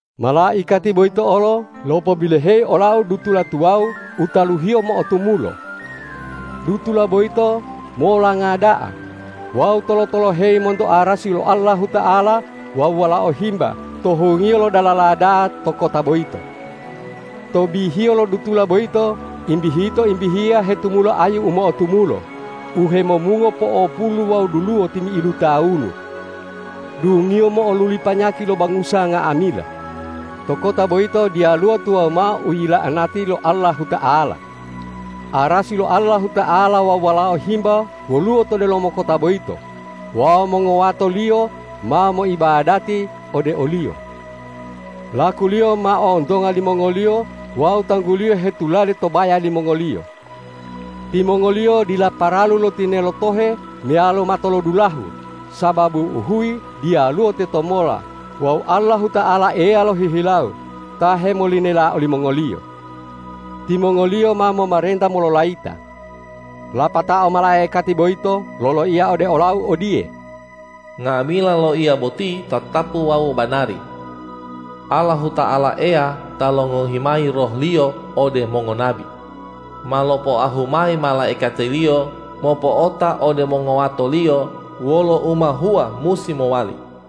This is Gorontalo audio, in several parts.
Malaikati boyito olo lopobiloheyi olau dutula tuwawu u taluhiyo mo'otumulo. Dutula boyito molanga da'a wawu tolo-toloheyi monto arasi lo Allahuta'ala wawu Walao Himba to hungiyo lo dalala da'a to kota boyito. To bihiyo lo dutula boyito imbihito-imbihiya hetumula ayu u mo'otumulo, u hemomungo po'opulu wawu duluwo timi'idu tawunu. Dungiyo mo'oluli panyaki lo bangusa nga'amila. To kota boyito diyaluwo tuwawu mao u yila'anati lo Allahuta'ala. Arasi lo Allahuta'ala wawu Walao Himba woluwo to delomo kota boyito wawu mongowato-Liyo ma moibadati ode o-Liyo. Laku-Liyo ma ontonga limongoliyo wawu Tanggu-Liyo hetulade to baya limongoliyo. Timongoliyo dila paralu lo tinelo tohe meyalo matolodulahu, sababu uhuyi diyaluwo tetomola wawu Allahuta'ala Eya lohihilawo ta hemolinela olimongoliyo. Timongoliyo ma momarenta mololayita. Lapatao malaikati boyito loloiya ode olau odiye,”Nga'amila loiya boti tatapu wawu banari. Allahuta'ala Eya ta longohi mayi Roh-Liyo ode mongonabi, ma lopoahu mayi malaikati-Liyo mopo'ota ode mongowato-Liyo wolo u ma hua musi mowali.”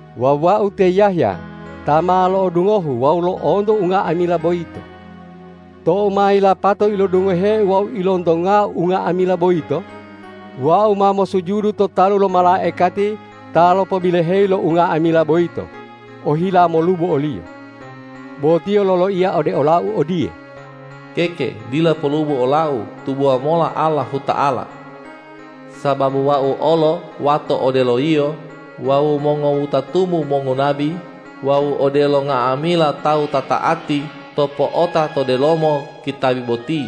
Wawu wau te Yahya ta ma lo'odungohu wawu lo'onto unga'amila boyito. Tou ma yilapato ilodungoheu wawu ilontongau unga'amila boyito, wau ma mosujudu to talu lo malaikati ta lopobiloheyi lo unga'amila boyito, ohila molubo oliyo. Bo tiyo loloiya ode olau odiye,”Keke, dila polubo olau; tubowa mola Allahuta'ala! Sababu wau olo wato odelo yio wawu mongowutatumu mongonabi wawu odelo nga'amila tawu ta ta'ati to po'ota to delomo kitabi boti!”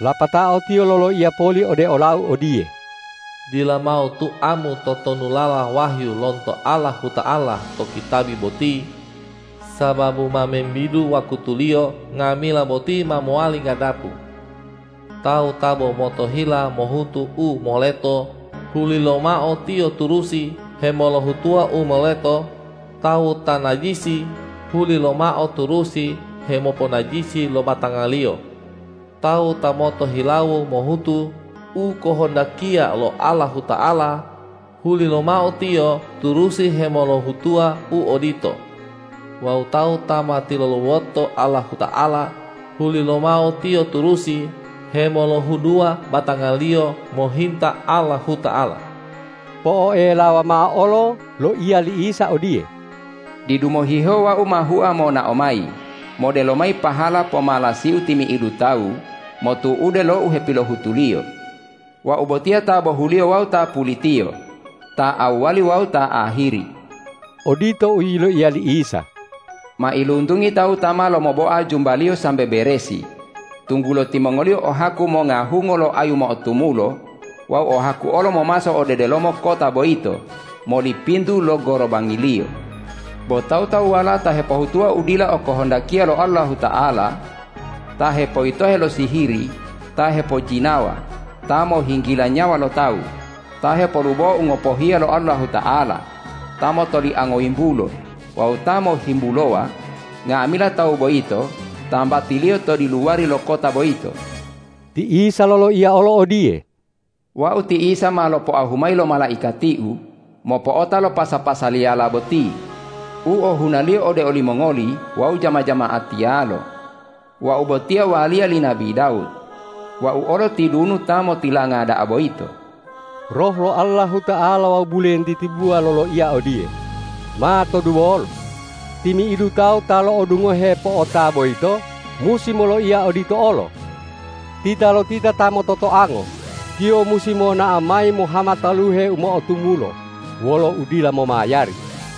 Lapatao tiyo loloiya poli ode olau odiye,”Dila mao tuamu totonulala wahyu lonto Allahuta'ala to kitabi boti, sababu ma membidu wakutuliyo nga'amila boti ma mowali ganapu. Tawu ta bo motohila mohutu u moleto, hulilomao tiyo turusi hemolohutuwa u moleto; tawu ta najisi, hulilomao turusi hemoponajisi lo batangaliyo; tawu ta motohilawo mohutu u okohondakiya lo Allahuta'ala, hulilomao tiyo turusi hemolohutuwa u odito; wawu tawu ta ma tilulawoto Allahuta'ala, hulilomao tiyo turusi hemolohuduwa batangaliyo mohinta Allahuta'ala.” Po'oelawa mao olo loiya li Isa odiye,”Didu mohihewo Wau ma hua monao mayi modelo mayi pahala pomalasi-U timi'idu tawu motu'ude lo u hepilohutuliyo. Wau botiya ta bohuliyo wawu ta pulitiyo, ta awwali wawu ta ahiri.” Odito u yiloiya li Isa. Mailuntungi tawu ta ma lomoboa jumbaliyo sambe beresi, tunggulo timongoliyo o haku monga hungo lo ayu mo'otumulo wawu o haku olo momaso ode delomo kota boyito moli pintu lo gorobangiliyo. Bo tawu-tawuwala ta hepohutuwa u dila okohondakiya lo Allahuta'ala, ta hepoyitohe lo sihiri, ta hepojinawa, ta mohinggila nyawa lo tawu, ta hepolubowa u ngopohiya lo Allahuta'ala, ta motoliango yimbulo wawu ta mohhimbulowa, nga'amila tawu boyito tambatiliyo to diluwari lo kota boyito. Ti Isa loloiya olo odiye,”Wau ti Isa ma lopoahu mayi lo malaikati-U mopo'ota lo pasa-pasaliyala boti u ohunaliyo ode olimongoli wawu jama-jama'atiyalo. Wau botiya waliya li nabi Dawud. Wau olo tidunu ta motilanga da'a boyito.” Roh lo Allahuta'ala wawu bulentiti buwa loloiya odiye: Matoduwolo! Timi'idu tawu ta lo'odungohe po'ota boyito musi moloiya odito olo! Titalotita ta mototoango, tiyo musi monao mayi mohama taluhe u mo'otumulo wolo udila momayari.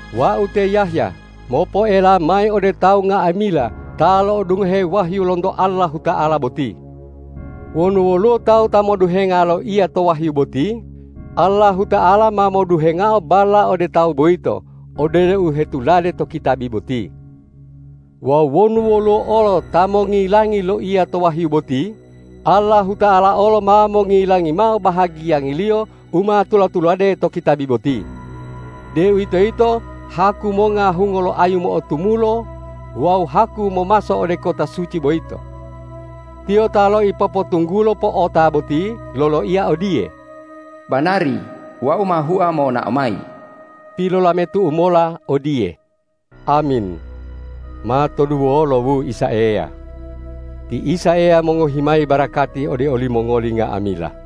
Wau te Yahya mopoela mayi ode tawu nga'amila ta lo'odungohe wahyu lonto Allahuta'ala boti. Wonu woluwo tawu ta moduhenga loiya to wahyu boti, Allahuta'ala ma moduhengao balla ode tawu boyito odelo u hetulade to kitabi boti. Wawu wonu woluwo olo ta mongilangi loiya to wahyu boti, Allahuta'ala olo ma mongilangi mao bahagiyangiliyo u ma tula-tulade to kitabi boti, deuwitoyito haku monga hungo lo ayu mo'otumulo wawu haku momaso ode kota suci boyito. Tiyo ta loipopotunggulo po'ota boti loloiya odiye,”Banari, Wau ma hua monao mayi!” Pilolametu'u mola odiye,”Amin! Matoduwolo, wu Isa Eya!” Ti Isa Eya mongohi mayi barakati ode olimongoli nga'amila.